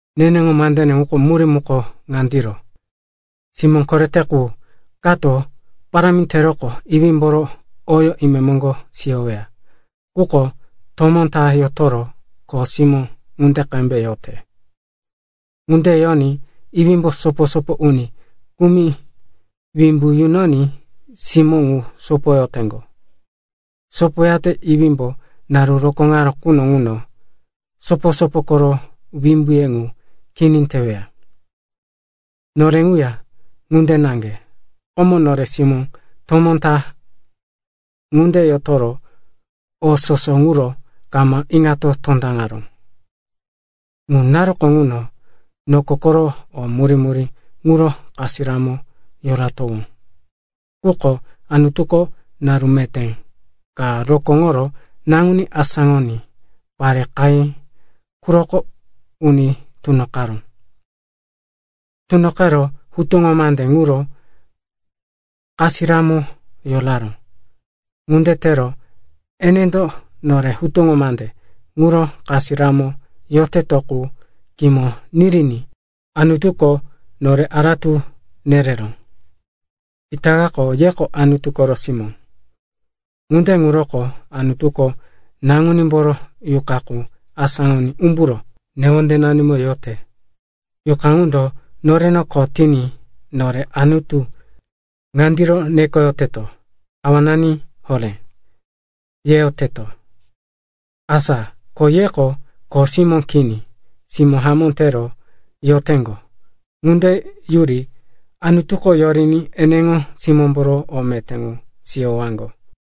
Neneŋo mandene ŋuro murí muko ŋandiro. Simó korete qu kato parámi teroqo iwímboro oyó imemoŋgo siyoweya. Quko tomó ta yotoro kho simó ŋunde qembe yote. Ŋunde yoní iwímbo sopo-sopo uni kumi wimbu yunoní simó ŋu sopoyoteŋgo. Sopoyate iwímbo naru rokóŋaró quno ŋuno sopo-sopo koro wimbuye ŋu kini teweya. Nore ŋuya ŋunde naŋge. Komo nore simó tomó ta ŋunde yotoro o soso ŋuro kama iŋato tondaŋaró. Ŋu naruko ŋuno noko koro o murí-murí ŋuro kasiramo yoratowó. Quko Anutuko naru meté ka rokóŋoro Naŋuní asáŋoní pare qahí quroko uni tunoqaró. Tunoqero hutuŋo mande ŋuro kasiramo yoraró. Ŋunde tero enendo nore hutuŋo mande ŋuro kasiramo yoteto qu kimo niriní Anutuko nore aratu nereró. Itakako yeko Anutu koro simó. Ŋunde ŋuroko Anutuko Naŋunímboro Yuqa qu asáŋoní umburo newondenanimo yote. Yuqa ŋundo noreno kho tiní nore Anutu ŋandiro nekoyoteto, “Awanani horé,” yeyoteto. Asa ko yeko kho simó kini, simó hamó tero yoteŋgo. Ŋunde yuri Anutuko yoriní eneŋo simómboro o meté ŋu siyowaŋgo.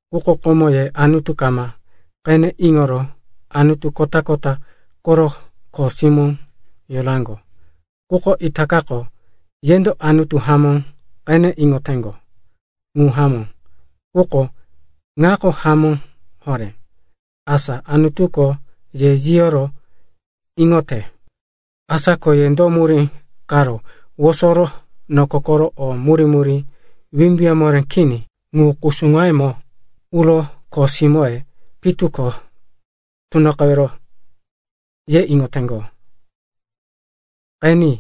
Quko komo ye Anutu kama qene iŋoro anutu kota-kota koro kho simó yoraŋgo. Quko itakako yendo Anutu hamó qene iŋoyoteŋgo. Ŋu hamó, quko ŋako hamó horé, asa Anutuko ye yiyoro iŋoyote. Asa ko ye do murí karo wosoro noko koro o murí-murí wimbuye moré kini ŋu kusuŋoyemo, uro kho simóye pitu ko tunoqewero, ye iŋoteŋgo? Qeni,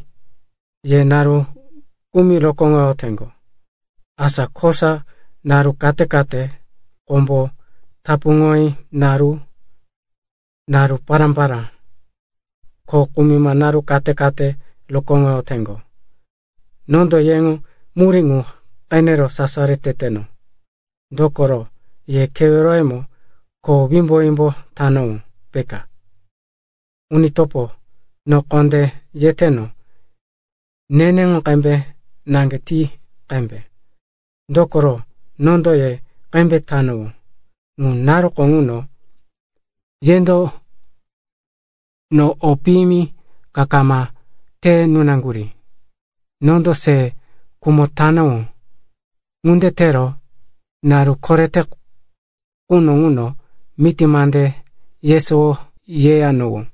ye naru kumi rokóŋoyoteŋgo, asa kosa naru kate-kate, kombo tapuŋoyote naru, naru pará-pará, ko kumima naru kate-kate rokóŋoyoteŋgo. Nondo yeŋo murí ŋu qenero sasaro teteno, dokoro ye keweroyemo kho wimbo-wimbo tanowó, peka. Uni topo, no kondé yeteno, neneŋo qembe naŋge ti qembe. Dokoro, nondo ye qembe tanowó. Ŋu naruko ŋuno yendo no o piyimi ka kama te nunaŋgurí. Ye iŋoteŋgo, komo nondo se khumo tanowó. Ŋunde tero naru korete quno ŋuno miti mande yesowo yeyanowó.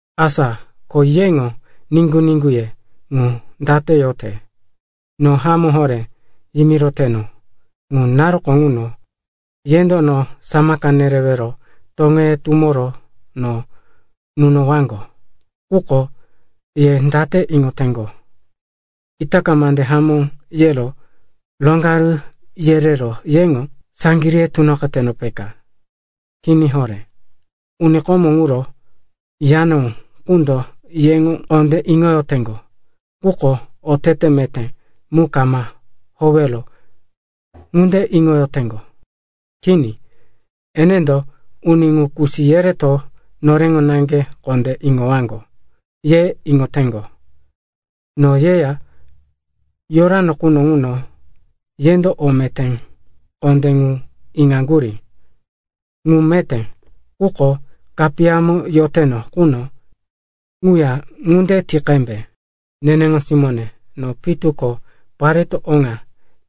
Asa ko yeŋo niŋgu-niŋguye ŋu dano yote? No hamó horé yimiroteno, ŋu naruko ŋuno, yendo no samaka nerewero toŋeye tumoro no nunowaŋgo. Quko ye date iŋoteŋgo? Itaka mande hamó yero roŋgaru yerero yeŋo saŋgiríye tunoqeteno, peka? Kini horé. Uni komo ŋuro yanowó qundo yeŋo kondé iŋoyoteŋgo. Quko otete meté mu kama howero ŋunde iŋoyoteŋgo. Kini, enendo, uni ŋu kusi yereto noreŋo naŋge kondé iŋowaŋgo, ye iŋoteŋgo. No yeya yorano quno ŋuno yendo o meté kondé ŋu iŋoyaŋgo, ŋu meté. Quko kapiyamo yoteno quno ŋuya ŋunde ti qembe. Nene simóne, no pitu ko pareto oŋa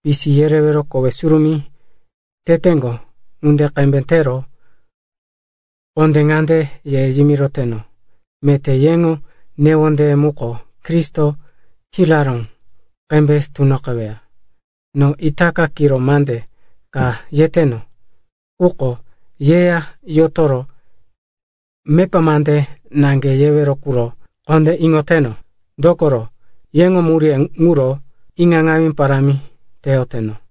pisi yerewero kowe surumí teteŋgo ŋunde qembe tero kondé ŋande ye iŋoyoteno, meté yeŋo newondeye muko Kristo kiraró qembe tunoqeweya. No itaka kiro mande ka yeteno, quko yeya yotoro mepa mande naŋge yewero ŋuro kondé iŋoyoteno. Dokoro yeŋo muríye ŋuro iŋaŋawí parámi teyoteno.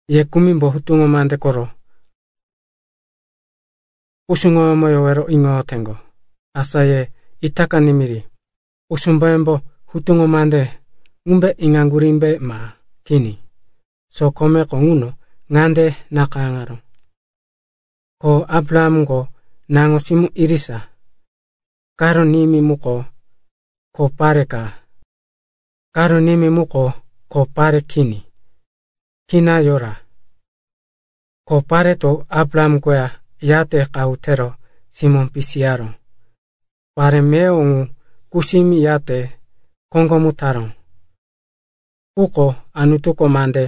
Ye kumimbo hutuŋo mande koro kusuŋoyómo yowero iŋoyoteŋgo, asa ye itaka nimiri. Kusumboyembo hutuŋo mande ŋumbe iŋaŋgurímbe, ma kini? Sokomeko ŋuno ŋande nakayáŋaró, ko Abrahamko naŋo-simó irisa, karo nimí muko kho pare ka, karo nimí muko kho pare kini, kina yora. Kho pareto Abraham koya yate qahu tero simó pisiyaró. Pare meyowo ŋu kusimi yate koŋgomu taró, quko Anutuko mande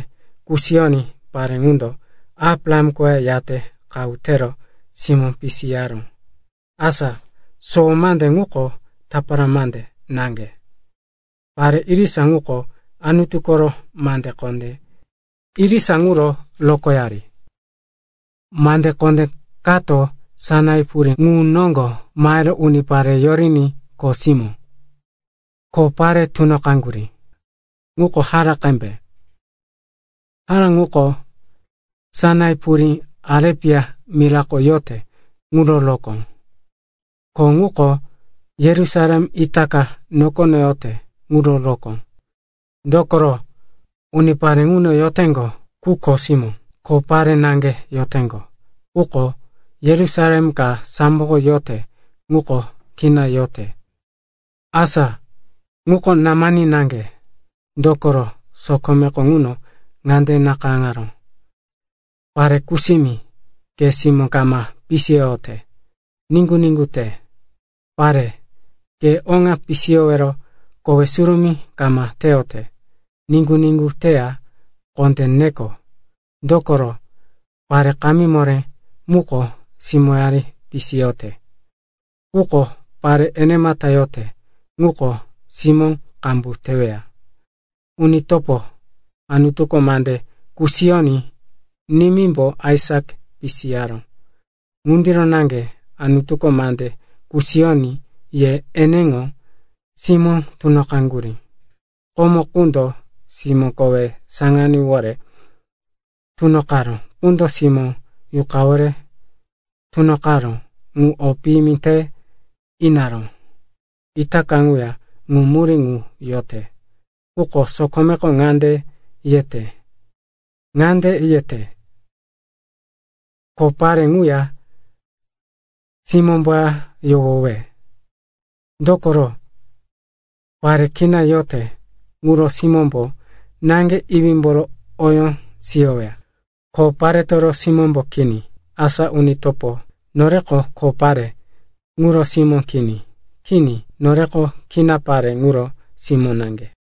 kusiyoní pare ŋundo Abraham koya yate qahu tero simó pisiyaró. Asa sowo mande ŋuko tapara mande naŋge. Pare irisa ŋuko Anutu koro mande kondé irisa ŋuro rokóyari. Mande kondé kato Sainai purí ŋu noŋgo mahero unipare yoriní kho simó, kho pare tunoqeteŋgo. Ŋuko Haka qembe. Haka ŋuko Sainai purí Arepia mirako yote ŋuro rokóŋo. Ko ŋuko Yerusalem itaka nokono yote ŋuro rokóŋo, dokoro unipare ŋuno yoteŋgo qu kho simó, kho pare naŋge yoteŋgo. Quko Yerusalem ka samboko yote ŋuko kina yote. Asa ŋuko námani naŋge. Dokoro sokomeko ŋuno ŋande nakayáŋaró, “Pare kusimi, ke simó kama pisiyoyote, niŋgu-niŋgu te. Pare, ke oŋa pisiyowero kowe surumí kama teyote niŋgu-niŋgu teya kondé neko. Dokoro pare kamí moré muko simóyari pisiyote, quko pare enemata yote ŋuko simó qambu teweya.” Uni topo, Anutuko mande kusiyoní nimímbo Aisak pisiyaró. Ŋundiro naŋge Anutuko mande kusiyoní ye eneŋo simó tunoqaŋgurí. Komo quno simó kowe saŋaníwore tunoqaró qundo simó Yuqawore tunoqaró ŋu o piyimi te inoyara. Itaka ŋuya ŋu murí ŋu yote. Quko sokomeko date yete? Ŋande yete, “Kho pare ŋuya simómboya yohowe. Dokoro pare kina yote ŋuro simómbo naŋge iwímboro oyó siyoweya, kho paretoro simómbo kini.” Asa uni topo, noreko kho pare ŋuro simó kini. Kini, noreko kina pare ŋuro simó naŋge.